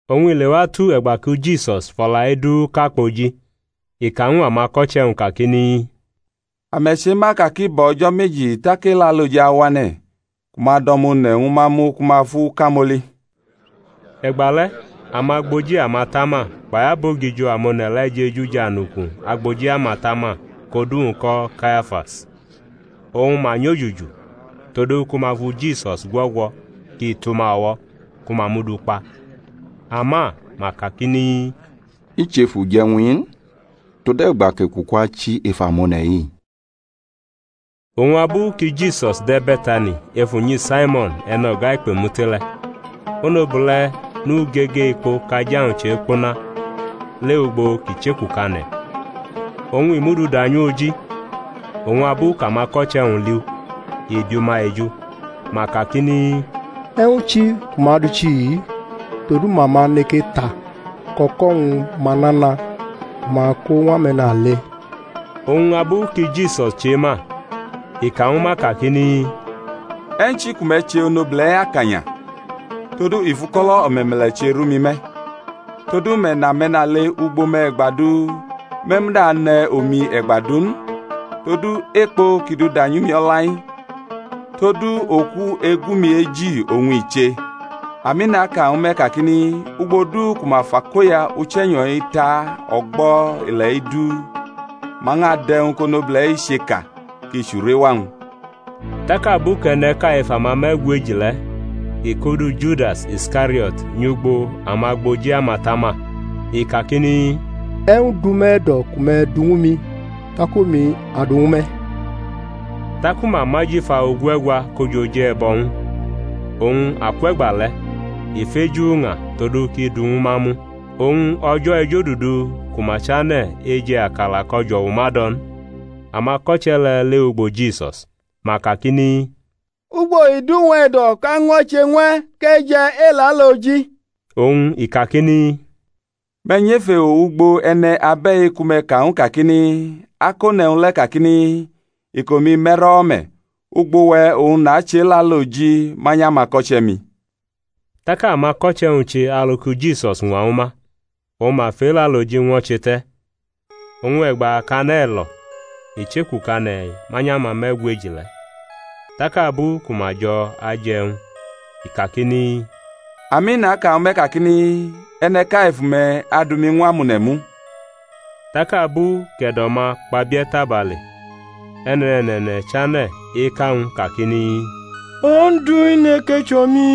Oñ i lewatu e̩gba ki Jisus fʼo̩la-i du ka kpoji, i ka ñw amako̩che̩-wñ kakini, Ame̩ chema ka ki bo̩ o̩jo̩ meji tak Elaloji awane̩, ku ma adʼO̩ma One̩ ñwu ma mu ku ma fʼu kamoli. E̩gba le̩ amagboji amatama kpai abogijo amone̩ le̩ jeju jʼanuku agboji amatama kʼodu-wñ ko̩ Kayafas; oñ ma nyojuju todu ku ma fu Jisus gwo̩gwo̩ kʼi tʼuma o̩wo̩ ku ma mʼu du kpa. Ama ma kakini, I chʼef uje̩wñ-i n, tode̩gba kʼekuku achi ef amone̩-i. Oñ abu ki Jisus de̩ Be̩tani ef unyi Saimo̩n e̩no̩ga ikpemute le̩, onobule̩ nʼugege ekpo kʼaja-wñ chekpuna lewʼugbo kʼi chekukane̩, oñ i mʼu du da nyʼu oji. Oñ abu kʼamako̩che̩-wñ li u, i bi ma eju, ma kakini, E̩wñ chi ku ma dʼu chihi-i? Todu ma ma neke ta kʼo̩ko̩-wñ ma nana, ku ma kʼo ñw ame̩nale. Oñ abu ki Jisus chema, i ka ñwu ma kakini, E̩wñ chi ku me̩ che onobule̩-i akanya? Todu i fʼuko̩lo̩ o̩me̩me̩le̩ che rʼumi me̩. Todu me̩ nʼame̩nale ugbo me̩ e̩gba du; me̩ muda ane̩ omi e̩gba du n. Todu ekpo kʼi du danyʼumi o̩la-i, todu oku-egu-mi eji oñ i che. Ami, naka ñwu me̩, kakini, Ugbo du ku ma fʼakoya Uche̩nyo̩-i ta o̩gbo̩ ile̩-i du, ma ñʼadʼe̩wñ kʼonobule̩-i che ka, kʼi chʼurewa-wñ. Tak abu kʼe̩ne̩ʼka ef amame̩gweji le̩ kʼi kʼodu Judas Iskariot nyʼugbo amagboji amatama, i kakini, E̩wñ dʼume̩ e̩do̩ ku me̩ du ñwu mi, tak omi adʼu ñwu me̩? Taku ma mʼajifa ogue̩gwa ko jʼoj e̩bo̩ ñw u. Oñ akwʼe̩gba le̩ i feju uña todu kʼi dʼu ñwu ma mu. Oñ o̩jo̩ ejodudu ku ma chane̩ eje̩ akala kʼo̩jo̩wu ma dʼo̩ n, amako̩che̩ le̩ lewʼugbo Jisus; ma kakini, Ugbo i dʼuwe̩ e̩do̩ kʼa ñwo̩che ñw e̩ kʼe̩ je̩ Elaloji? Oñ i kakini, Me̩ nyʼef ewo ugbo e̩ne̩ abe̩-i ku me̩ ka ñw u kakini, Akone̩ e̩wñ le̩ kakini, Iko-mi me̩rʼo̩wo̩ me̩; ugbo we̩ oñ nachʼElaloji manyʼamako̩che̩-mi. Tak amako̩che̩-wñ che alu ki Jisus ñwa ñwu ma, oñ ma fʼElaloji ñwo̩che te̩. Oñ e̩gba kʼane̩ lo̩ i chekukane̩ manyʼamame̩gweji le̩. Tak abu ku ma jo̩ aje̩ e̩wñ i kakini, Ami, naka ñwu me̩ kakini, E̩ne̩ʼka ef ume̩ adu mi ñw amone̩ mu. Tak abu kʼe̩do̩-ma kpabie̩ tabale e̩ne̩ne̩ne̩ne̩ chane̩ eka ñw u kakini, Ondu, i neke chʼomi?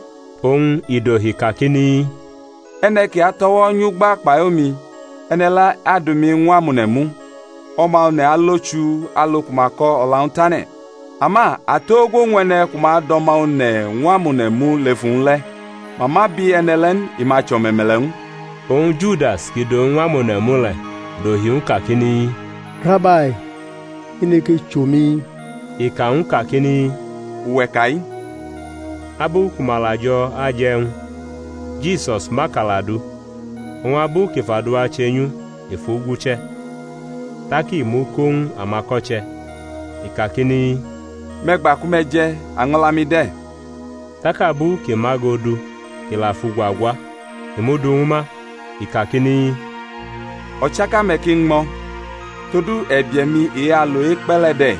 Oñ i dohi kakini, E̩ne̩ ki atʼo̩wo̩ nyʼugba kpai omi, e̩ne̩ le̩ adu mi ñw amone̩ mu. O̩ma One̩ alo chuu, alu ku ma ko̩ o̩la-wñ tane̩. Ama atogwo ñw e̩ne̩ ku ma adʼO̩ma One̩ ñw amone̩ mu lef uwñ le̩! Ma ma bi e̩ne̩ le̩ n, i ma chʼo̩me̩me̩le̩ ñw u. Oñ Judas, kʼi dʼowñ ñw amone̩ mu le̩, dohi ñw u kakini, Rabai, i neke chʼomi? I ka ñw u kakini, Uwe̩ ka-i. Abu ku ma la jo̩ aje̩ e̩wñ, Jisus mʼakala du, oñ abu kʼi fʼaduwa chenyʼu, i fʼu guche̩, tak i mʼu ko ñw amako̩che̩, i kakini, Me̩ gba ku me̩ je̩; año̩la-mi de̩. Tak abu kʼi mʼago du kʼi la fʼugwa gwa, i mʼu du ñwu ma; i kakini, O̩chaka-me̩ ki ñmʼo̩. Todu e̩bie̩-mi e-alo ekpe̩ le̩ de̩-i,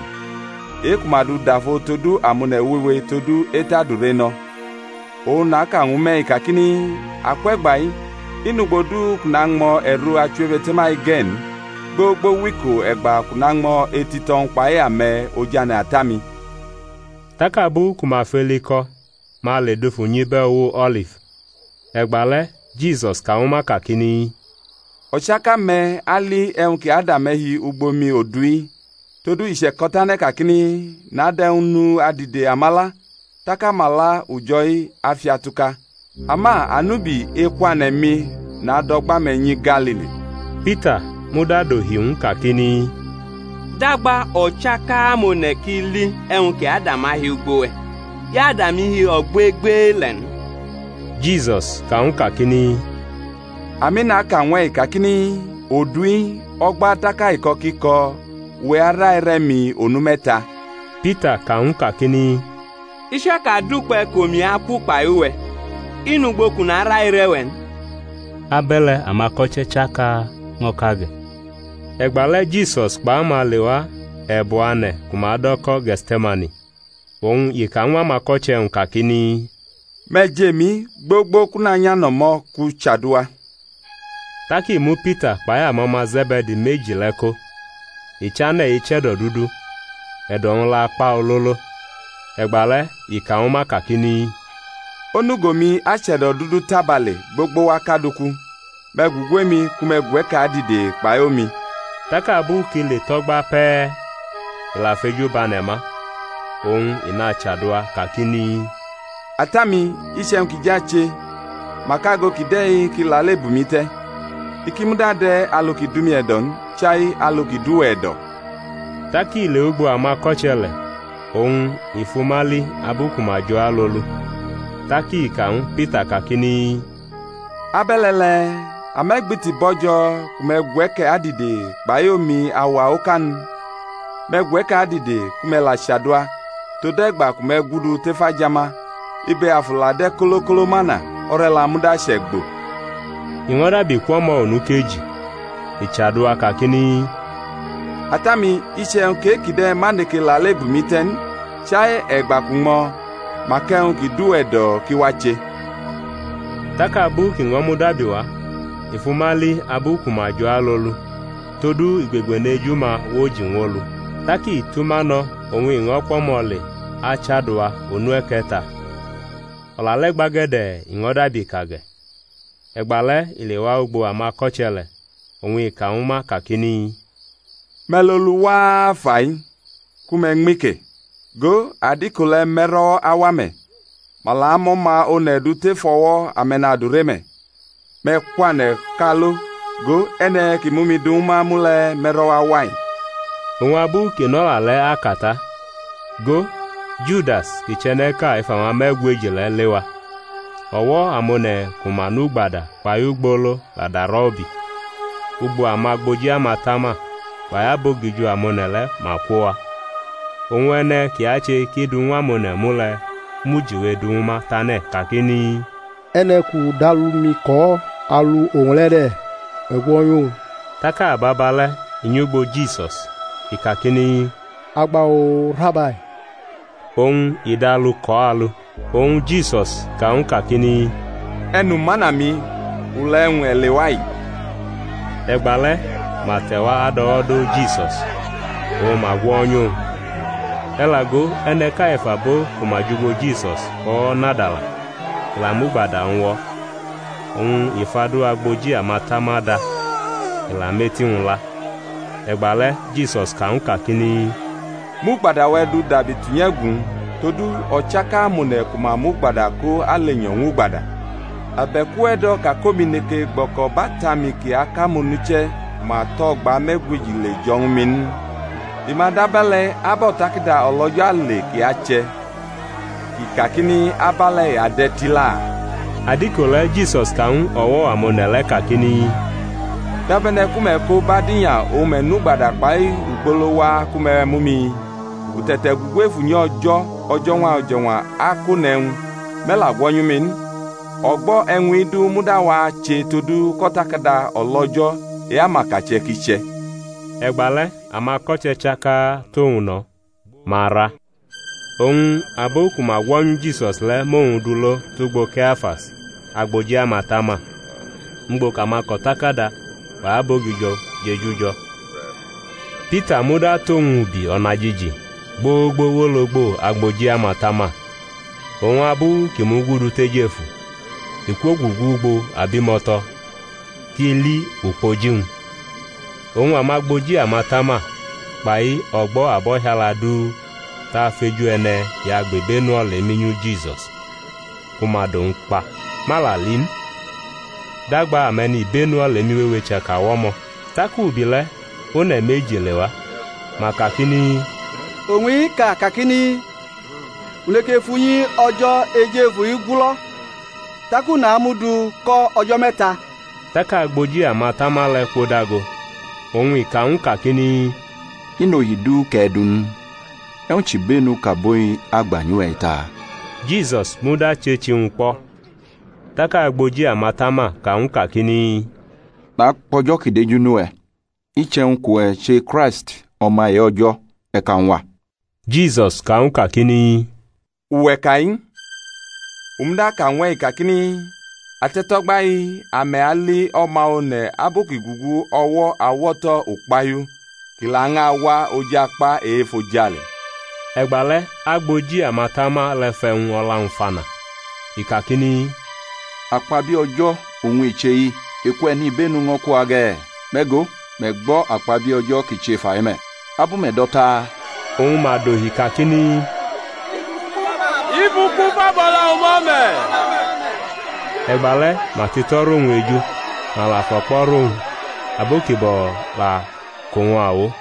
e-ku ma dʼu dafo todu amone̩ wewe todu etʼadure no̩. Oñ naka ñwu me̩-i kakini, Akwe̩gba-i i nʼugbo du kʼu nañmo̩ e̩ro achiwebe̩te̩ma-i ge̩ n, gbogbo wʼiko e̩gba kʼu nañmo̩ etito̩-wñ kpai ame̩ ojane̩ Ata-mi. Tak abu ku ma fʼeli ko̩ ma le dufu nyʼibe̩ uwo O̩lif. E̩gba le̩ Jisus ka ñwu ma kakini, O̩chaka-me̩ ali e̩wñ ki ada me̩ hi ugbo mi odu-i. Todu i che̩ko̩tane̩ kakini, Nadʼe̩wñ nu adide amala, tak amala ujo̩-i afiatuka. Ama anubi ekwane̩-mi nadʼo̩gba-me̩ nyi Galili. Pita muda dohi ñw u kakini, Dagba o̩chaka amone̩ ki li e̩wñ ki ada ma hi ugbo we̩, i ada mi hi ogbegbele̩ n. Jisus ka ñw u kakini, Ami, naka ñw e̩-i, kakini, Odu-i o̩gba tak aiko̩ ki ko̩, uwe̩ araire̩ mi onu me̩ta. Pita ka ñw u kakini, I chaka dʼukpe̩ kʼomi aku kpai uwe̩, i nʼugbo kʼu naraire̩ we̩ n. Abe̩le̩ amako̩che̩ chaka ño̩ ka ge̩. E̩gba le̩ Jisus kpʼama lewa e̩bu ane̩ ku ma do̩ ko̩ Ge̩tse̩mani, oñ i ka ñw amako̩che̩-wñ kakini, Me̩ jʼemi gbogbo kʼu nanyʼano̩mo̩ kʼu chaduwa. Tak i mu Pita kpai amo̩ma Ze̩be̩di meji le̩ ko, i chane̩ eche̩do̩dudu, e̩do̩-wñ la kpa ololo. E̩gba le̩ i ka ñwu ma kakini, Onugo-mi ache̩do̩dudu tabale gbogbo wa kad uku; me̩ gugu emi, ku me̩ gwe̩ke̩ adide kpai omi. Tak abu kʼi le tʼo̩gba pe̩e̩ i la fʼeju bʼane̩ ma, oñ i nachaduwa kakini, Ata-mi, iche̩wñ kʼi jʼache, mak ago kide̩ ki lale bʼumi te̩; i ki muda de̩ alu ki dʼumi e̩do̩ n, chaialu ki dʼuwe̩ e̩do̩. Tak i lewʼugbo amako̩che̩ le̩ oñ i fʼuma li abu ku ma jo̩ alolu. Tak i ka ñwu Pita kakini, Abe̩le̩ le̩e̩, ame̩ gbiti bo̩jo̩ ku me̩ gwe̩ke̩ adide kpai omi auwa oka n? Me̩ gwe̩ke̩ adide ku me̩ la chaduwa, tode̩gba ku me̩ gudu tef ajama. Ibe afu la de̩ kolo kolo mana, o̩re̩la muda chʼe̩gbo. I ño̩ dabi kwʼo̩mo̩ onu ekeji, i chaduwa kakini, Ata-mi, iche̩wñ kʼe-kide̩ ma neke lale bʼumi te̩ n, chai e̩gba kʼu ñmʼo̩, mak e̩wñ ki dʼuwe̩ e̩do̩ ki wache. Tak abu kʼi ño̩ mudabi wa, i fʼuma li abu ku ma jʼalolu, todu igbegbeneju-ma woji ñw olu. Tak i tʼuma no̩ oñ i ño̩ kwʼo̩mo̩ le achaduwa onu e̩ke̩ta; o̩la le̩ gbage̩de̩ i ño̩ dabi ka ge̩. E̩gba le̩ i lewa ugbo amako̩che̩ le̩ oñ i ka ñwu ma kakini, Me̩ lolu waa fai, ku me̩ ñmi ke; go adiko le̩ me̩ro̩wo̩ awa me̩; ma la mʼO̩ma One̩ du tʼef o̩wo̩ ame̩nadure me̩. Me̩ kwane̩ kʼa alo; go, e̩ne̩ kʼi mʼumi du ñwu ma mu le̩ me̩ro̩wo̩ awa-i. Oñ abu kʼi nʼo̩la le̩ aka ta, go, Judas, kʼi chʼe̩ne̩ʼka ef amame̩gweji le̩, lewa; o̩wo̩ amone̩ ku ma nʼugbada kpai ugbolo la darʼo̩ ubi; ugbo amagboji amatama kpai abogijo amone̩ le̩ ma kwo wa. Oñ e̩ne̩ kʼi ache kʼi dʼu ñw amone̩ mu le̩ mʼujiwe du ñwu ma tane̩ kakini, E̩ne̩ kʼu dʼalu-mi kʼo̩ alu owñ le̩ de̩, me̩ gwo̩nyʼuwñ. Tak ababa le̩ i nyʼugbo Jisus, i kakini, Agba-oo. Rabai! Oñ i dʼalu kʼo̩ alu. Oñ Jisus ka ñw u kakini, E̩numana-mi, ule̩ e̩wñ e̩ lewa-i? E̩gba le̩ ma te̩wa adʼo̩wo̩ do Jisus, oñ ma gwo̩nyʼuwñ, E̩ la go, e̩ne̩ʼka ef abo ku ma jʼugbo Jisus fʼo̩wo̩ nadala, i la mʼugbada-wñ wo̩, oñ i fʼadu agboji amatama da, i la mʼeti-wñ la. E̩gba le̩ Jisus ka ñw u kakini, Mʼugbada-we̩ du dabi tunyʼe̩gu-wñ; todu o̩chaka amone̩ ku ma mʼugbada ko alenyo̩ ñw ugbada. Abe̩k uwe̩ do̩ ka kʼomi neke gbo̩ko̩bʼAta-mi kʼi akʼamonuche̩ ku ma tʼo̩gba me̩gweji le jo̩ ñwu mi n? I ma dʼabe̩le̩ ab O̩takada O̩lo̩jo̩ ale ki ache̩, kʼi kakini, Abe̩le̩ i ade̩ tila. Adiko le̩ Jisus ka ñw o̩wo̩ amone̩ le̩ kakini, Dabe̩ne̩ ku me̩ ko bʼadinya oñ me̩ nʼugbada kpai ugbolo wa ku me̩ mu mi? U te̩te̩ gugu ef unyi O̩jo̩ o̩jo̩ñwa o̩jo̩ñwa akʼone̩ e̩wñ, me̩ la gwo̩nyu mi n. O̩gbo̩ e̩wñ-i du muda wache todu kʼO̩takada O̩lo̩jo̩ e-amakache̩ kʼi che̩. E̩gba le̩ amako̩che̩ chaka tʼowñ no̩, ma ra. Oñ abo ku ma gwo̩nyu Jisus le̩ mʼowñ du lo tʼugbo Kayafas agboji amatama, ugbo kʼamako̩takada kpai abogijo jeju jo̩. Pita muda tʼowñ ubi o̩najiji, gbogbo wʼologbo agboji amatama, oñ abu kʼi mugudu tʼejefu, i kwogugu ugbo abimo̩to̩ kʼi li ukpoji-wñ. Oñ amagboji amatama kpai o̩gbo̩ abo̩hiala du tʼafeju e̩ne̩ ki agbʼibenu olemi nyu Jisus ku ma dʼowñ kpa. Ma la li n, dagba ame̩nibenu olemi wewe chaka wʼo̩mo̩. Tak ubi le̩ one̩ meji lewa, ma kakini, Owñ-i ka kakini, U neke fʼunyi O̩je̩ Ejefu-i gulo̩ tak u namʼu du ko̩ o̩jo̩ me̩ta. Tak agboji amatama le̩ kwodago, oñ i ka ñw u kakini, I nʼohi du kʼe̩ du n? E̩wñ chʼibenu kʼabo-i agba nyʼuwe̩-i taa? Jisus muda chechi-wñ kpo̩, Tak agboji amatama ka ñw u kakini, NakpʼO̩jo̩ kʼi deju nʼuwe̩, iche̩wñ kʼuwe̩ che Kraisti, O̩ma e-O̩jo̩, e̩ ka ñw a. Jisus ka ñw u kakini, Uwe̩ ka-i. U muda aka ñw e̩-i, kakini, Ate̩to̩gba-i ame̩ ali O̩ma One̩ abu kʼi gugu o̩wo̩ awo̩to̩ Ukpahiu, kʼi lañʼawa oj akpa e-efojale. E̩gba le̩ agboji amatama le̩ fʼe̩wñ o̩la-wñ fana, i kakini, Akpabie̩ O̩jo̩ oñ i che-i! Eku e̩nibenu ño̩ ku wa ge̩? Me̩ go, me̩ gbo̩ akpabie̩ O̩jo̩ kʼi che fai me̩. Abu me̩ do̩ taa? Oñ ma dohi kakini, I fʼuku fa bʼo̩la-wñ ma me̩. E̩gba le̩ ma tʼito̩ rʼowñ eju, ma la fʼo̩kpo̩ rʼowñ; abo ki bo̩ la kʼowñ awo,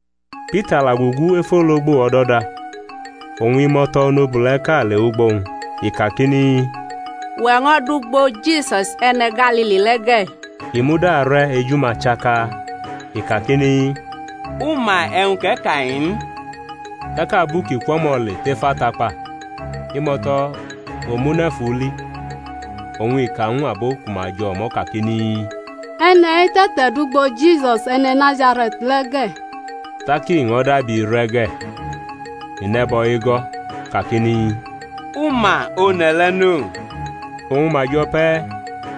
Pita la gugu ef ologbo o̩do̩da; oñ imo̩to̩ onobule̩ʼka lewʼugbo-wñ, i kakini, Uwe̩ ño̩ dʼugbo Jisus e̩ne̩ Galili le̩ ge̩. I muda re̩ eju-ma chaka; i kakini, U ma e̩wñ kʼe̩ ka-i n. Tak abu kʼi kwʼo̩mo̩ le tʼef atakpa, imo̩to̩ omune̩ fʼu li, oñ i ka ñw abo ku ma jʼo̩mo̩ kakini, E̩ne̩-i te̩te̩dʼugbo Jisus, E̩ne̩ Nazare̩t le̩ ge̩. Tak i ño̩ dabi re̩ ge̩, i nʼe̩bo̩ ego̩, kakini, U ma one̩ le̩ no. Oñ ma jo̩ pe̩e̩,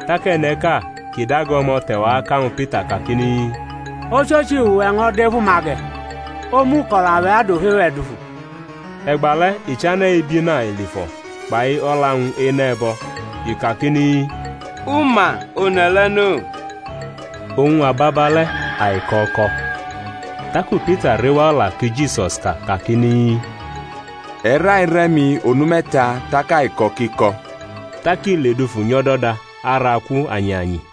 tak e̩ne̩ʼka kʼi dago o̩mo̩ te̩wa aka ñwu Pita kakini, Ochochi, uwe̩ ño̩ dʼef uma ge̩, omu uko̩la-we̩ adʼofe-we̩ dufu. E̩gba le̩ i chane̩ ebina elifo̩ kpai o̩la-wñ enʼe̩bo̩, i kakini, U ma one̩ le̩ no. Oñ ababale̩ aiko̩ ko̩. Taku Pita rewa o̩la ki Jisus ka kakini, E̩ raire̩ mi onu me̩ta tak aiko̩ kʼi ko̩. Tak i ledufu nyʼo̩do̩da araku anyianyi.